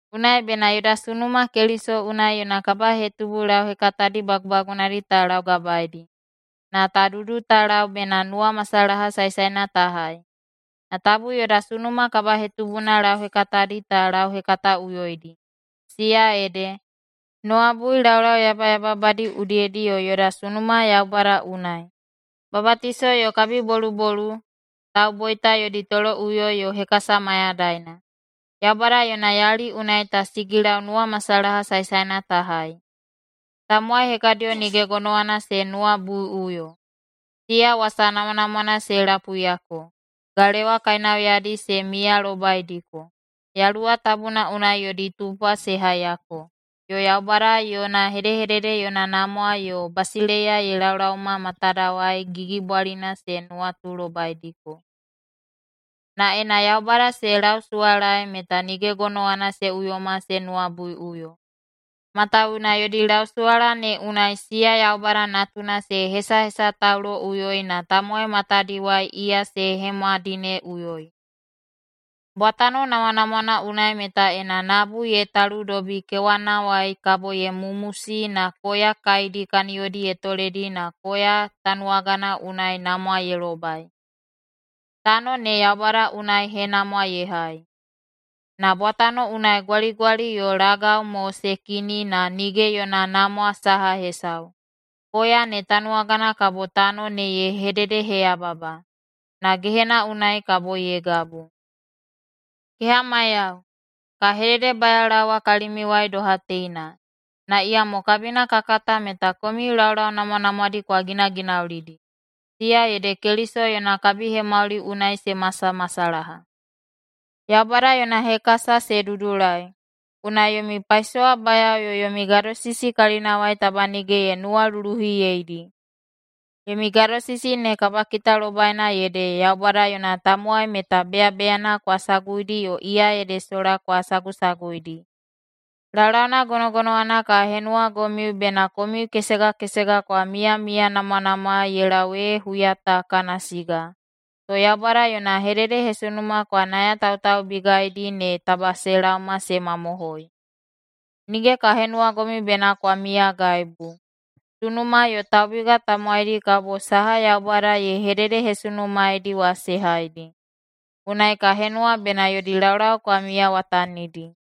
Unai bena yoda sunuma Keliso unai yona kabahetubu lauhekatadi bagubagunadi ta laugabaeidi, na ta dudu ta lau bena nuwamasalaha saesaena ta hai. Na tabu yoda sunuma kabahetubuna lauhekatadi ta lauhekataꞌuyoidi, siya ede: nuwabui laulau yabayababadi udiyedi yo yoda sunuma Yaubada unai, babatiso yo kabibolubolu, tauboita yodi toloꞌuyo yo hekasa mayadaina. Yaubada yona yali unai ta sigilau nuwamasalaha saesaena ta hai. Tamowai hekadiyo nige gonowana se nuwabuiꞌuyo. Siya wasa namwanamwana se lapuiyako, galewa kainauyadi se miyalobaidiko, Yaluwa Tabuna unai yodi tupwa se haiyako, yo Yaubada yona hedehedede yona namwa yo basileiya ye laolaoma matadawai gigibwalina se nuwatulobaidiko. Na ena Yaubada se lausuwalaei meta nige gonowana se uyoma se nuwabuiꞌuyo, matawuwuna yodi lausuwala ne unai siya Yaubada Natuna se hesahesatauloꞌuyoi na tamowai matadiwai iya se hemwadineꞌuyoi. Bwatano namwanamwana unai meta ena nabu ye taludobi kewanawai kabo ye mumusi na koya kaidi kaniyodi ye toledi na koya tanuwagana unai namwa ye lobai. Tano ne Yaubada unai henamwa ye hai. Na bwatano unai gwaligwali yo lagau mo se kini na nige yona namwa saha hesau, koya ne tanuwagana kabo tano ne ye hededeheyababa. Na gehena unai kabo ye gabu. Kehamaiyao, ka hededebayaolaowa kalimiuwai doha teina, na iyamo kabina ka kata meta komiu laulau namwanamwadi kwa ginaginaulidi, siya ede Keliso yona kabihemauli unai se masamasalaha. Yaubada yona hekasa se dudulai, unai yomi paisowabayao yo yomi gadosisi kalinawai taba nige ye nuwaluluhiyeidi. Yomi gadosisi ne kabakitalobaina ede Yaubada yona tamowai meta beyabeyana kwa saguidi yo iya ede sola kwa sagusaguidi. Laulauna gonogonowana ka henuwagomiu bena komiu kesega kesega kwa miyamiyanamwanamwaei ye lau ee huya ta kana siga, to Yaubada yona hededehesunuma kwa nayatautaubigaidi ne taba se laoma se mamohoi. Nige ka henuwagomiu bena kwa miyagaibu. Sunuma yo taubiga tamowaidi kabo saha Yaubada ye hededehesunumaedi wa se haidi. Unai ka henuwa bena yodi laulau kwa miyawatanidi.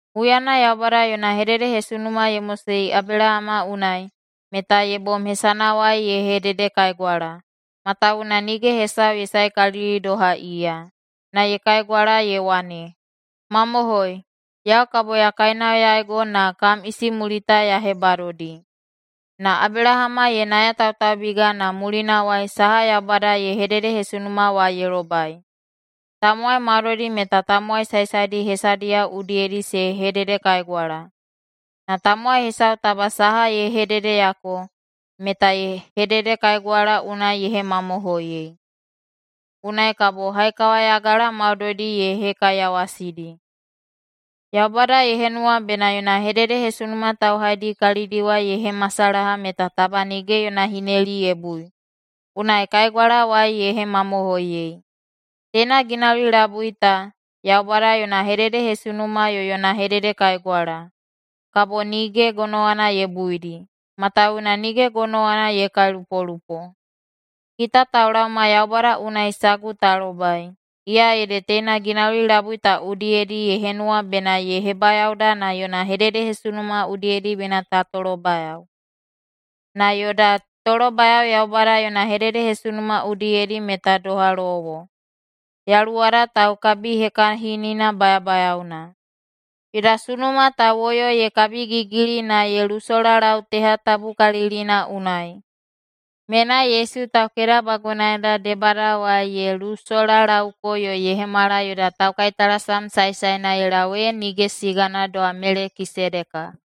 Huyana Yaubada yona hededehesunuma ye mosei Abelahama unai, meta ye bom hesanawai ye hededekaigwala, matawuwuna nige hesau ye saekalili doha iya. Na ye kaigwala ye wane, “Mamohoi, yau kabo ya kainauyaigo na kam isimulita ya hebadodi.” Na Abelahama ye nayatautaubiga na mulinawai saha Yaubada ye hededehesunuma wa ye lobai. Tamowai maudoidi meta tamowai saesaedi hesadiyao udiyedi se hededekaigwala. Na tamowai hesau taba saha ye hededeyako, meta hededekaigwala unai ye hemamohoiyei. Unai kabo haikawayagala maudoidi ye hekaiyawasidi. Yaubada ye henuwa bena yona hededehesunuma tauhaidi kalidiwai ye hemasalaha meta taba nige yona hineli ye bui, unai kaigwalawai ye hemamohoiyei. Teina ginauli labui ta, Yaubada yona hededehesunuma yo yona hededekaigwala, kabo nige gonowana ye buidi, matawuwuna nige gonowana ye kailupolupo. Kita taulaoma Yaubada unai sagu ta lobai, iya ede teina ginauli labui ta udiyedi ye henuwa bena ye hebayaoda na yona hededehesunuma udiyedi bena ta tolobayao. Na yoda tolobayao Yaubada yona hededehesunuma udiyedi meta doha lowo, yaluwada taukabihekahinina bayabayaona. Yoda sunuma ta woyo ye kabigigili na ye lusolalau teha tabukalilina unai. Menai Yesu taukedabagunaeda debadawai ye lusolalaoko yo ye hemala yoda taukaitalasam saesaena ye lau ee nige sigana doha Melekisedeka.